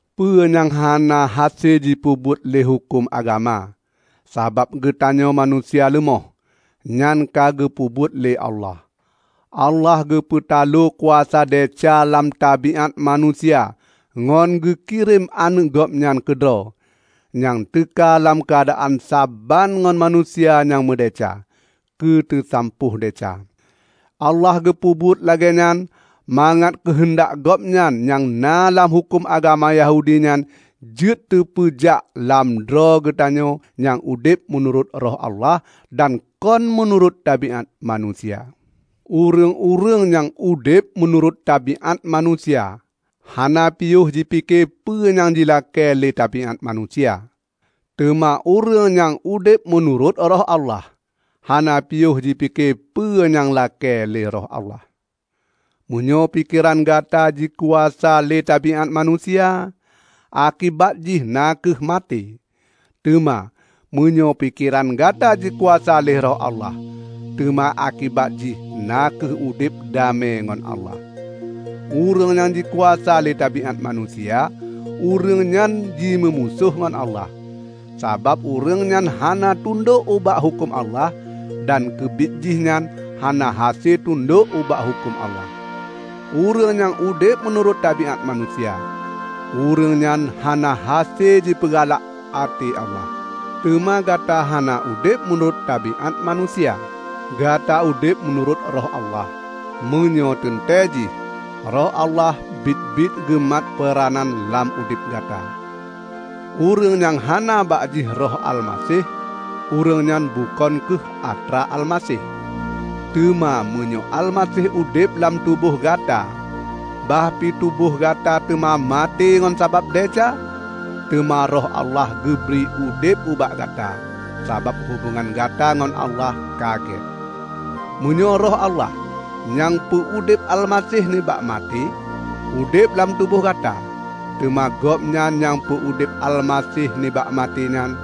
Peue nyang hana hase jipeubuet lé huköm agama, sabab geutanyoe manusia leumoh, nyan ka geupeubuet lé Allah. Allah geupeutaloe kuasa desya lam tabiát manusia ngon geukirém Aneuëk Gobnyan keudroe, nyang teuka lam keuadaan saban ngon manusia nyang meudesya, keu teusampôh desya. Allah geupeubuet lagée nyan mangat keuheundak Gobnyan nyang na lam huköm agama Yahudi nyan jeuet teupeujak lam droe geutanyoe nyang udeb meunurot Roh Allah dan kon meunurot tabiát manusia. Ureuëng-ureuëng nyang udeb meunurot tabiát manusia, hana piôh jipike peue nyang jilakée lé tabiát manusia. Teuma ureuëng nyang udeb meunurot Roh Allah, hana piôh jipike peue nyang lakée lé Roh Allah. Meunyoe pikeran gata jikuasa lé tabiát manusia, akibat jih na kheueh maté. Teuma meunyoe pikeran gata jikuasa lé Roh Allah, teuma akibat jih na kheueh udeb damé ngon Allah. Ureuëng nyang jikuasa lé tabiát manusia, ureuëng nyan jimeumusoh ngon Allah; sabab ureuëng nyan hana tundok ubak huköm Allah; dan keubiet jihnyan hana hase tundok ubak huköm Allah. Ureuëng nyang udeb meunurot tabiát manusia, ureuëng nyan hana hase jipeugalak até Allah. Teuma gata hana udeb meunurot tabiát manusia. Gata udeb meunurot Roh Allah -- meunyoe, teuntée jih, Roh Allah biet-biet geumat peuranan lam tuboh gata. Ureuëng nyang hana bak jih Roh Almaseh, ureuëng nyan bukon kheueh atra Almaseh. Teuma meunyoe Almaseh udeb lam tuboh gata, bah pi tuboh gata teuma maté ngon sabab desya, teuma Roh Allah geubri udeb ubak gata, sabab hubongan gata ngon Allah ka gét. Meunyoe Roh Allah, nyang peu-udeb Almaseh nibak maté, udeb lam tuboh gata, teuma Gobnyan nyang peu-udeb Almaseh nibak maté nyan,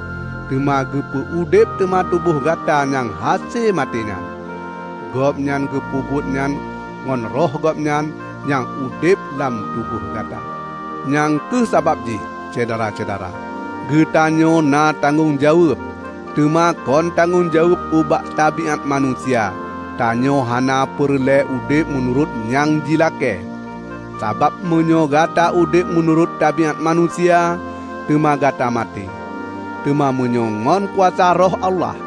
teuma geupeu udeb teuma tuboh gata nyang hase maté nyan. Gobnyan geupeubuet nyan ngon Roh Gobnyan nyang udeb lam tuboh gata. Nyang kheueh sabab jih, Syedara-syedara, geutanyoe na tanggong jaweueb; teuma kon tanggong jaweueb ubak tabiát manusia; tanyoe hana peureulée udeb meunurot nyang jilakée. Sabab meunyoe gata udeb meunurot tabiát manusia, teuma gata maté; teuma meunyoe ngon kuasa Roh Allah,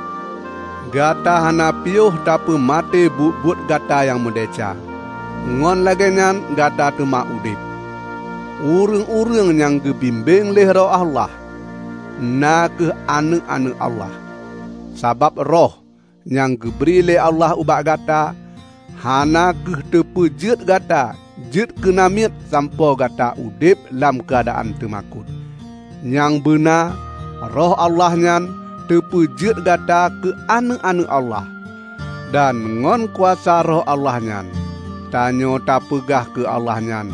gata hana piôh tapeumaté buet-buet gata nyang meudesya, ngon lagée nyan gata teuma udeb. Ureuëng-ureuëng nyang geubimbéng lé Roh Allah, na kheueh aneuëk-aneuëk Allah. Sabab Roh, nyang geubri lé Allah ubak gata, hana kheueh teupeujeuet gata jeuet keu namiet sampoe gata udeb lam keuadaan teumakot. Nyang beuna Roh Allah nyan teupeujeuet gata keu aneuëk-aneuëk Allah. Dan ngon kuasa Roh Allah nyan tanyoe tapeugah keu Allah nyan,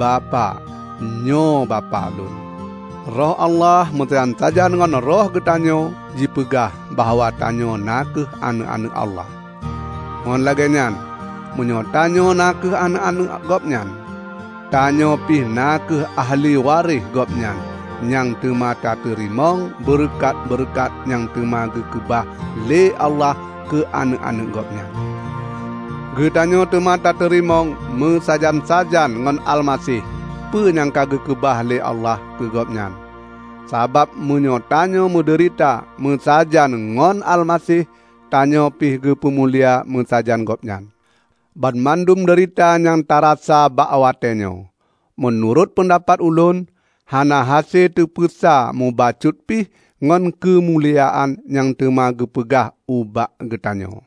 "Bapak, nyoe Bapak lôn!" Roh Allah meusajan-sajan ngon roh geutanyoe jipeugah bahwa tanyoe na kheueh aneuëk-aneuëk Allah. Ngon lagée nyan, meunyoe tanyoe na kheueh aneuëk-aneuëk Gobnyan, tanyoe pih na kheueh ahli waréh Gobnyan nyang teuma tateurimong beureukat-beureukat nyang teuma geukeubah lé Allah keu aneuëk-aneuëk Gobnyan. Geutanyoe teuma tateurimong meusajan-sajan ngon Almaseh peue nyang ka geukeubah lé Allah keu Gobnyan; sabab meunyoe tanyoe meudeurita meusajan ngon Almaseh, tanyoe pih geupeumulia meusajan Gobnyan. Banmandum deurita nyang tarasa bak watée nyoe, meunurot peundapat ulôn, hana hase tapeusa mubacut pih ngon keumuliaan nyang teuma geupeugah ubak geutanyoe.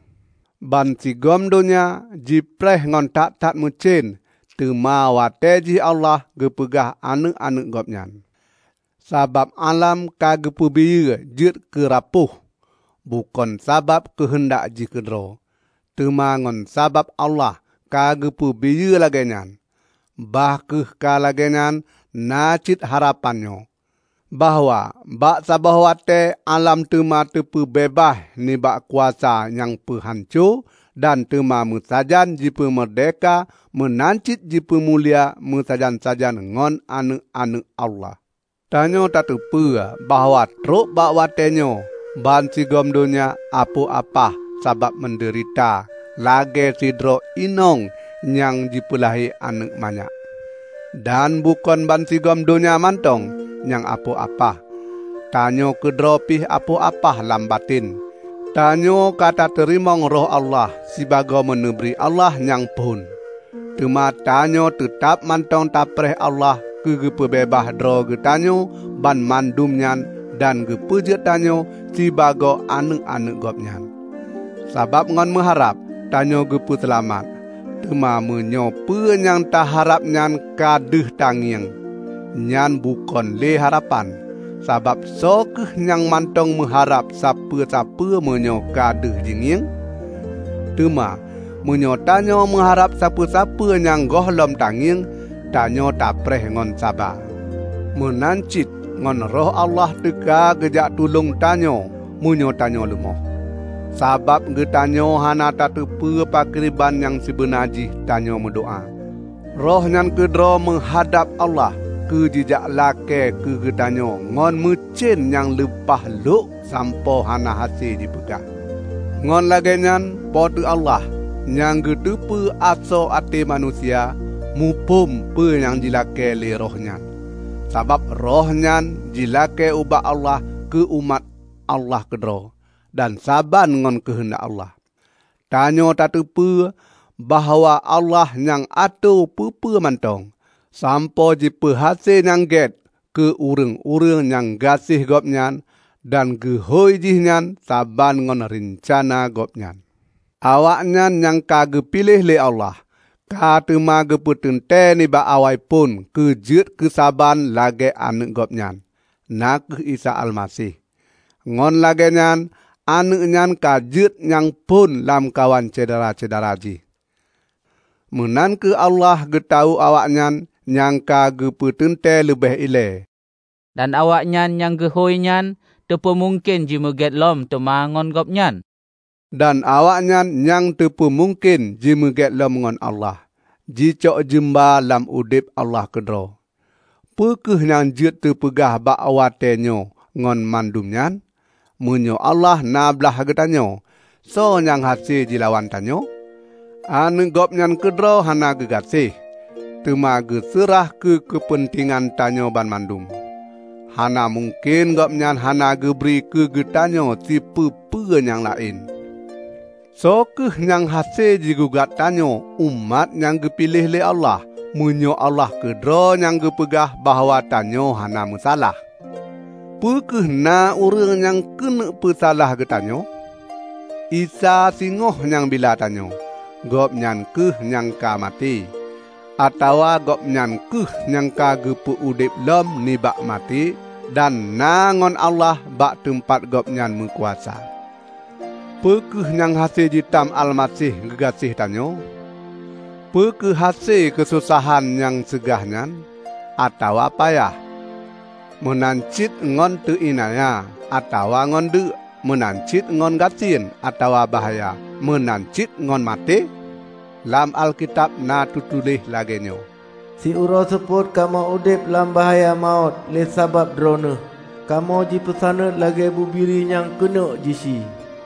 Bansigom donya jipreh ngon that-that meucen teuma watée jih Allah geupeugah aneuëk-aneuëk Gobnyan. Sabab álam ka geupeubiyeu jeuet keu rapôh, bukon sabab keuheundak jih keudroe, teuma ngon sabab Allah geupeubiyeu lagée nyan. Bah kheueh ka lagée nyan na cit harapan nyoe: bahwa bak saboh watée álam teuma geupeubeubaih nibak kuasa nyang peuhanco dan teuma meusajan jipeumeurdehka meunan cit jipeumulia meusajan-sajan ngon aneuëk-aneuëk Allah. Tanyoe tateupeue bahwa trok bak watéenyoe bansigom donya apoh apah sabab meudeurita lagée sidroe inong nyang jipeulahé aneuëk manyak. Dan bukon bansigom donya mantong nyang apoh apah; tanyoe keudroe pih apoh apah lam baten. Tanyoe ka tateurimong Roh Allah sibagoe meuneubri Allah nyang phon, teuma tanyoe teutab mantong tapreh Allah geupeubeubaih droe geutanyoe banmandum nyan dan geupeujeuet tanyoe sibagoe aneuëk-aneuëk Gobnyan. Sabab ngon meuharab, tanyoe geupeu seulamat. Teuma meunyoe peue nyang taharab nyan ka deuh tangieng, nyan bukon le harapan. Sabab soe kheueh nyang mantong meuharab sapeue-sapeue meunyoe ka deuh jingieng? Teuma meunyoe tanyoe meuharab sapeue-sapeue nyang gohlom tangieng, tanyoe tapreh ngon saba. Meunan cit ngon Roh Allah teuka geujak tulông tanyoe meunyoe tanyoe leumoh. Sabab geutanyoe hana tateupeue pakriban nyang sibeuna jih tanyoe meudoá; Roh nyan keudroe meuhadab Allah keu jijak lakée keu geutanyoe ngon meucen nyang leupah lhok sampoe hana hase jipeugah. Ngon lagée nyan Po teu Allah, nyang geuteupeue asoe até manusia, muphom peue nyang jilakée lé Roh nyan; sabab Roh nyan jilakée ubak Allah keu umat Allah keudroe, dan saban ngon keuheundak Allah. Tanyoe tateupeue bahwa Allah nyang atoe peue-peue mantong, sampoe jipeuhase nyang gét keu ureuëng-ureuëng nyang gaséh Gobnyan dan geuhôi jihnyan saban ngon reuncana Gobnyan. Awaknyan nyang ka geupiléh lé Allah, ka teuma geupeuteuntée nibak awaiphon keu jeuet keusaban lagée Aneuëk Gobnyan, na kheueh Isa Almaseh. Ngon lagée nyan Aneuëk nyan ka jeuet nyang phon lamkawan syedara-syedara jih. Meunan kheueh Allah geutawök awaknyan nyang ka geupeuteuntée leubeh ilée; dan awaknyan nyang geuhôi nyan, teupeumungken jimeugét lom teuma ngon Gobnyan. Dan awaknyan nyang teupeumungken jimeugét lom ngon Allah, jicok jeumba lam udeb Allah keudroe. Peu kheueh nyang jeuet teupeugah bak watée nyoe ngon mandum nyan? Meunyoe Allah na blaih geutanyoe, soe nyang hase jilawan tanyoe? Aneuëk Gobnyan keudroe hana geugaséh, teuma geuseurah keu keupeuntengan tanyoe banmandum; hana mungken Gobnyan hana geubri keu geutanyoe sipeue-peue nyang laén? Soe kheueh nyang hase jigugat tanyoe umat nyang geupiléh lé Allah, meunyoe Allah keudroe geupeugah bahwa tanyoe hana meusalah? Peu kheueh na ureuëng nyang keuneuk peusalah geutanyoe? Isa singoh nyang bila tanyoe! Gobnyan kheueh nyang ka maté, atawa Gobnyan kheueh nyang ka geupeu udeb lom nibak maté dan na ngon Allah bak teumpat Gobnyan meukuasa. Peu kheueh nyang hase jitam Almaseh geugaséh tanyoe? Peu kheueh hase keusosahan nyang seugah nyan, atawa payah, meunan cit ngon teu iénanya, atawa ngon deuek, meunan cit ngon gasien, atawa bahya, meunan cit ngon maté? Lam Alkitab na teutuléh lagée nyoe, "Siuroe seupôt kamoe udeb lam bahya mawöt lé sabab Droeneueh. Kamoe jipeusaneut lagée bubiri nyang keuneuk jisie."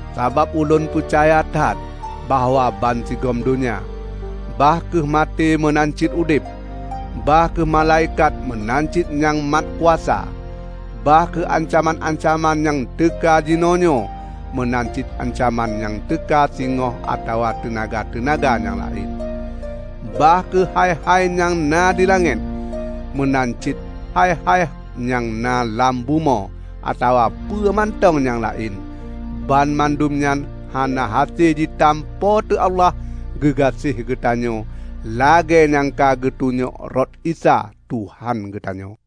Sabab ulôn peucaya that bahwa bansigom donya, bah kheueh maté meunan cit udeb, bah kheueh malaikat meunan cit nyang mat kuasa, bah kheueh ancaman-ancaman nyang teuka jinoenyoe meunan nyang ancaman nyang teuka singoh atawa teunaga-teunaga nyang laén; bah kheueh hai-hai nyang na di langét, meunan cit hai-hai nyang na lam bumoe atawa peue mantong nyang laén, banmandum nyan hana hase jitam Po teu Allah geugaséh geutanyoe, lagée nyang ka geutunyok rot Isa, Tuhan geutanyoe.